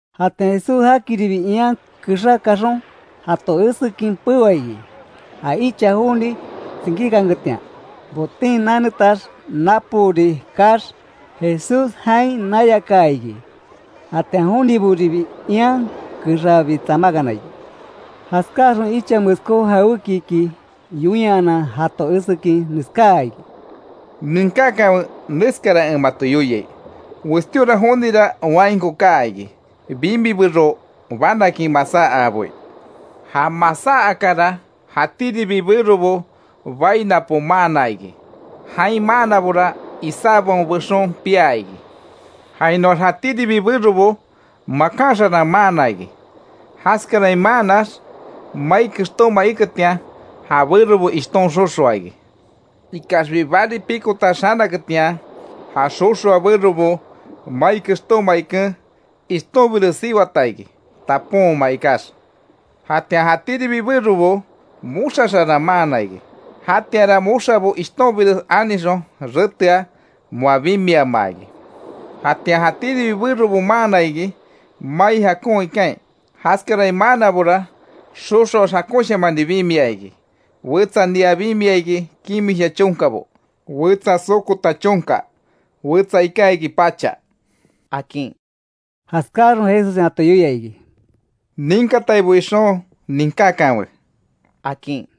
Jatian Jesús jakiribi ian kexá kaxon, jato esekin peoa iki. Ja icha joni tsinkíkanketian, boten nanetax napoori kaax Jesús jain nayakaa iki. Jatian jonibobiribi ian kexabi tsamákana iki. Jaskáaxon icha meskó jawékiki yoinyanan jato esekin, neskáa iki: —Ninkákanwe neskara en mato yoiai: Westíora jonira wainko kaa iki, bimi bero banakin masáa aaboi. Ja masá akara, jatíribi berobo bai napo maana iki. Jain maanabora, isábaon bexon piá iki. Jainoax jatíribi berobo makan xarán maana iki. Jaskarain maannax, mai kextóma iketian, ja berobo ishton xoxoa iki, ikaxbi bari pikotax xanaketian, ja xoxoa berobo, mai kextóma iken, ishtonbires siwata iki, taponma ikax. Jatian jatíribi berobo moxa xaran maana iki. Jatianra moxabo ishtonbires anixon retea, moa bimiamaa iki. Jatian jatíribi berobo maana iki, mai jakon ikain. Jaskarain maannabora, xoxoax, jakonshamani bimia iki: wetsa nia bimia iki, kimisha chonkabo; wetsa sokota chonka, wetsa iká iki, pacha —akin. Jaskáxon, Jesussen jato yoia iki: —Ninkataibo ixon, ninkákanwe —akin.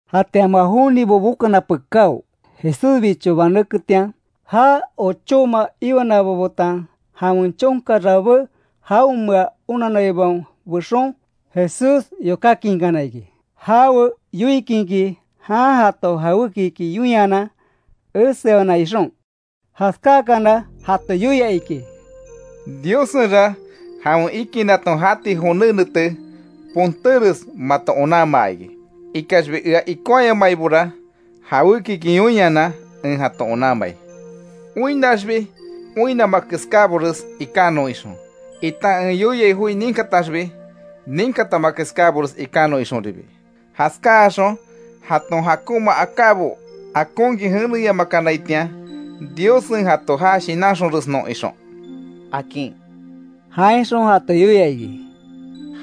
Jatian moa jonibo bokana pekáo, Jesúsbicho banéketian, já ochóma iwanabo betan jawen chonka rabé jaonmea onanaibaon bexon, Jesús yokákinkana iki; jawe yoikinki jan jato jawékiki yoinyanan, esewana ixon. Jaskákana jato yoia iki: —Diossenra jawen ikinnaton jati joné nete, pontéres mato onanmaa iki. Ikaxbi ea ikonhayamaibora jawékiki yoinyanan en jato onanmai, oinnaxbi, oinnama keskábores ikanon ixon, itan en yoiai joi ninkataxbi ninkatama keskábores ikanon ixonribi. Jaskáaxon jaton jakonma akábo akonkin jeneyamakanaitian, Diossen jato ja shinanxonresnon ixon —akin. Jainxon jato yoia iki: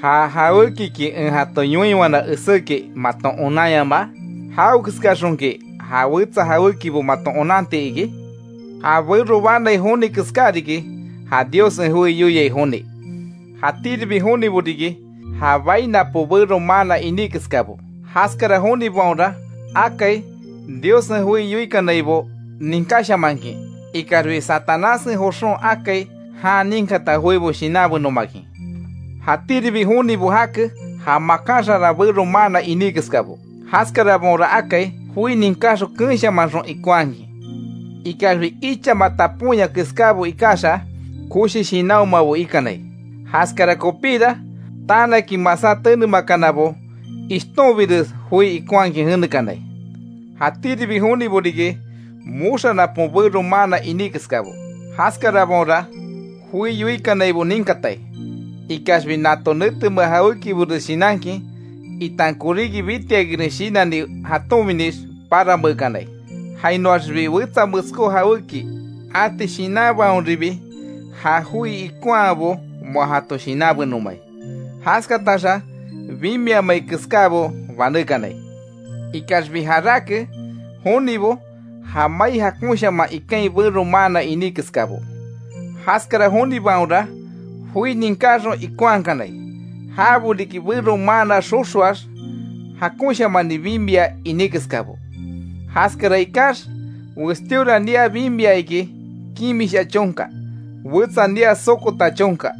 —¿Ja jawékiki en jato yoinwana eséki maton onanyamaa? ¿Jawekeskaxonki ja wetsa jawékibo maton onanti iki? Ja bero banai joni keská riki, ja Diossen joi yoiai joni. Jatíribi jonibo riki, ja bai napo bero maana iní keskabo. Jaskara jonibaonra akai, Diossen joi yoikanaibo ninkáshamankin, ikaxbi Satanássen joxon akai jan ninkata joibo shinanbenomakin. Jatíribi jonibo jake, ja makan xaran bero maana iní keskabo. Jaskarabaonra akai joi ninkaxon keenshamanxon ikonhakin, ikaxbi ichama taponya keskábo ikaxa, koshi shinanhomabo ikanai. Jaskara kopíra, tanakin masá tenemakanabo ishtonbires joi ikonhakin jenekanai. Jatíribi jonibo riki, moxa napon bero maana iní keskabo. Jaskarabaonra joi yoikanaibo ninkatai, ikaxbi nato netemea jawékibores shinankin itan koríki bitiakinres shinanni jatonbinix parameekanai. Jainoaxibi wetsa meskó jawéki ati shinanbaonribi, ja joi ikonhabo moa jato shinanbenomai. Jaskataxa bimiamai keskábo banékanai. Ikaxbi jarake jonibo, ja mai jakonshaman ikain bero maanna iní keskabo. Jaskara jonibaonra joi ninkáxon ikonhakanai. Jabo riki bero maana xoxoax jakonshamani bimia iní keskabo. Jaskara ikax; westíora nia bimia iki kimisha chonka, wetsa nia sokota chonka;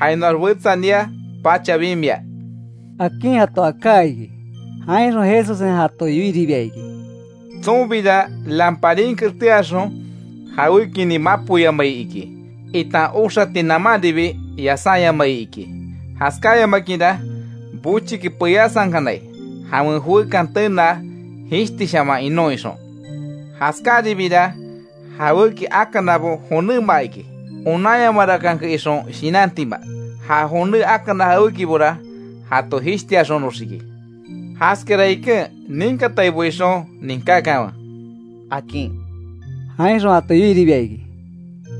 jainoax wetsa nia pacha bimia —akin jato aká iki. Jainxon Jesussen jato yoiribia iki: —Tsonbira lamparin keteaxon jawékinin mapoyamai iki, itan oxati namanribi yasányamai iki. Jaskáyamakinra bochiki peyasankanai; jawen joekan tenaa jishtishaman inon ixon. Jaskáribira jawéki akanabo jonéma iki; onanyamarakanke ixon shinantima. Ja joné akana jawékibora jato jishtiaxonoxiki. Jaskara iken, ninkataibo ixon, ninkákanwe —akin. Jainxon jato yoiribia iki: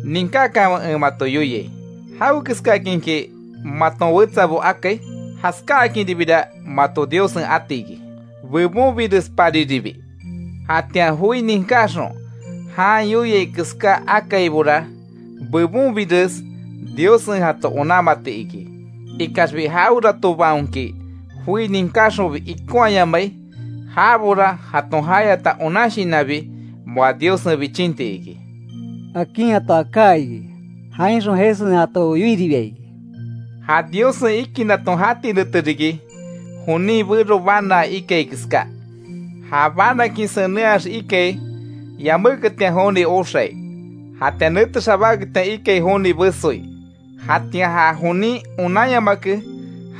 —Ninkakanwe en mato yoiai: jawekeskakinki maton wetsabo akai, jaskáakinribira mato Diossen ati iki, bebonbirespariribi. Jatian joi ninkáxon jan yoiai keská akaibora, bebonbires Diossen jato onanmati iki. Ikaxbi jaweratobaonki joi ninkáxonbi ikonhaayamai jabora jaton jayata onan shinanbi moa Diossen bichinti iki —akin jato aká iki. Jainxon Jesussen jato yoiribia iki: —Ja Diossen ikinnaton jati nete riki, jonin bero banaa ikai keská. Ja banakin senenhax ikai; yaméketian joni oxai. Jatian nete xabáketian ikai joni besoi. Jatian ja jonin onanyamake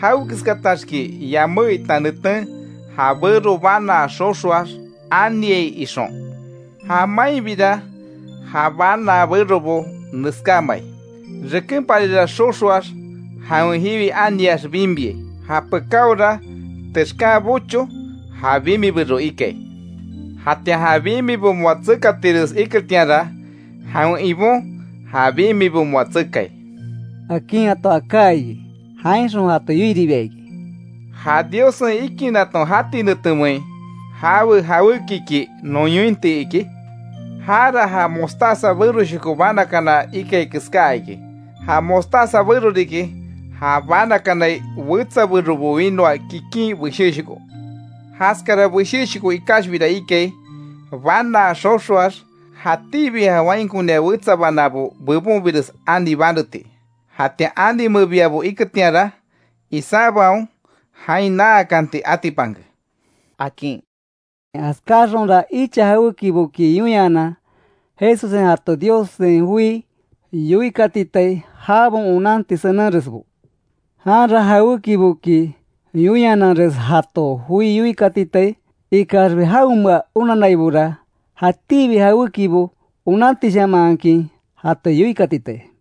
jawekeskataxki yamé itan neten ja bero banaa xoxoax aniai ixon. Ja mainbira ja banaa berobo neskámai; rekenpari xoxoax jawen jiwi aniax bimiai. Japekáora texkan bocho, ja bimi bero ikai. Jatian ja bimibo moa tsekatires iketianra, jawen ibon ja bimibo moa tsekai —akin jato aká iki. Jainxon jato yoiribia iki: —¿Ja Diossen ikinnaton jati netemein jawe jawékiki non yointi iki? Jara, ja mostaza beroshoko banakana ikai keská iki. Ja mostaza bero riki, ja banakanai wetsa berobo winoa kikin beshéshoko. Jaskara beshéshoko ikaxbira ikai, banaa xoxoax, jatíbi ja wainkonia wetsa banábo bebonbires ani baneti, jatian ani mebiabo iketianra isábaon jain naakanti atipanke —akin. Jaskáaxonra icha jawékiboki yoinhanan, Jesussen jato Diossen joi yoikatitai, jabaon onanti senenresbo. Janra jawékiboki yoinhananres jato joi yoikatitai. Ikaxbi jaonmea onanaibora jatíbi jawékibo onantishamanhakin jato yoikatitai.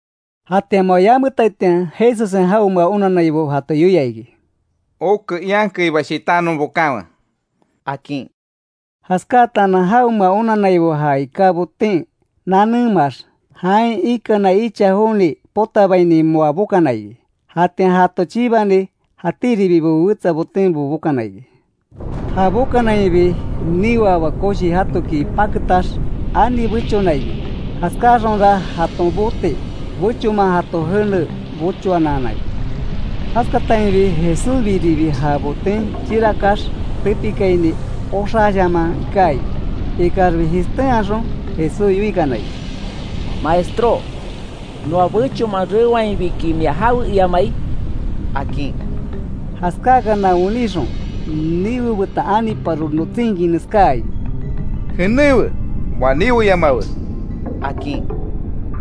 Jatian moa yametaitian Jesussen jaonmea onannaibo jato yoia iki: —Oke ian keiba shitánon bokanwe —akin. Jaskáatanan jaonmea onannaibo já iká boten nanémaax, jain ikana icha joni potabaini moa bokana iki. Jatian jato chibani, jatíribibo wetsa botenbo bokana iki. Ja bokanainbi niweaba koshi jatoki paketax, ani bechona iki. Jaskáxonra jaton bote, bechonman jato jene bochoanaana iki. Jaskatainbi Jesúsbiribi ja boten chirakax tepikaini oxaashaman iká iki. Ikaxbi jishtenhaxon Jesús yoikana iki: —Maestró ¿Noa bechonman reoainbiki mia jawe iamai? —akin. Jaskáakana wenixon, niwe betan aniparo notsinkin neskáa iki: —Jenéwe, moa niweyamawe —akin.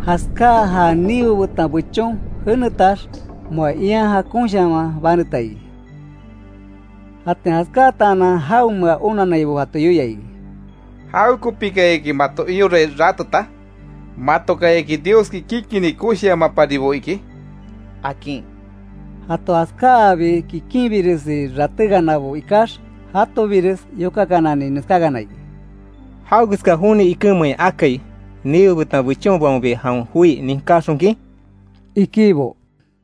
Jaskáa ja niwe betan bechon jenetax, moa ian jakonshaman baneta iki. Jatian jaskátaanan jaonmea onannaibo jato yoia iki: —¿Jawekopikayaki mato iorai rateta? ¿Matokayaki, Dioski kikinni koshiamaparibo iki? —akin. Jato jaskáabi kikinbiresi ratékanabo ikax, jatobires yokakanani neskákana iki: —¿Jawekeska joni ikenmein akai, niwe betan bechonbaonbi jawen joi ninkáxonkin? —ikibo.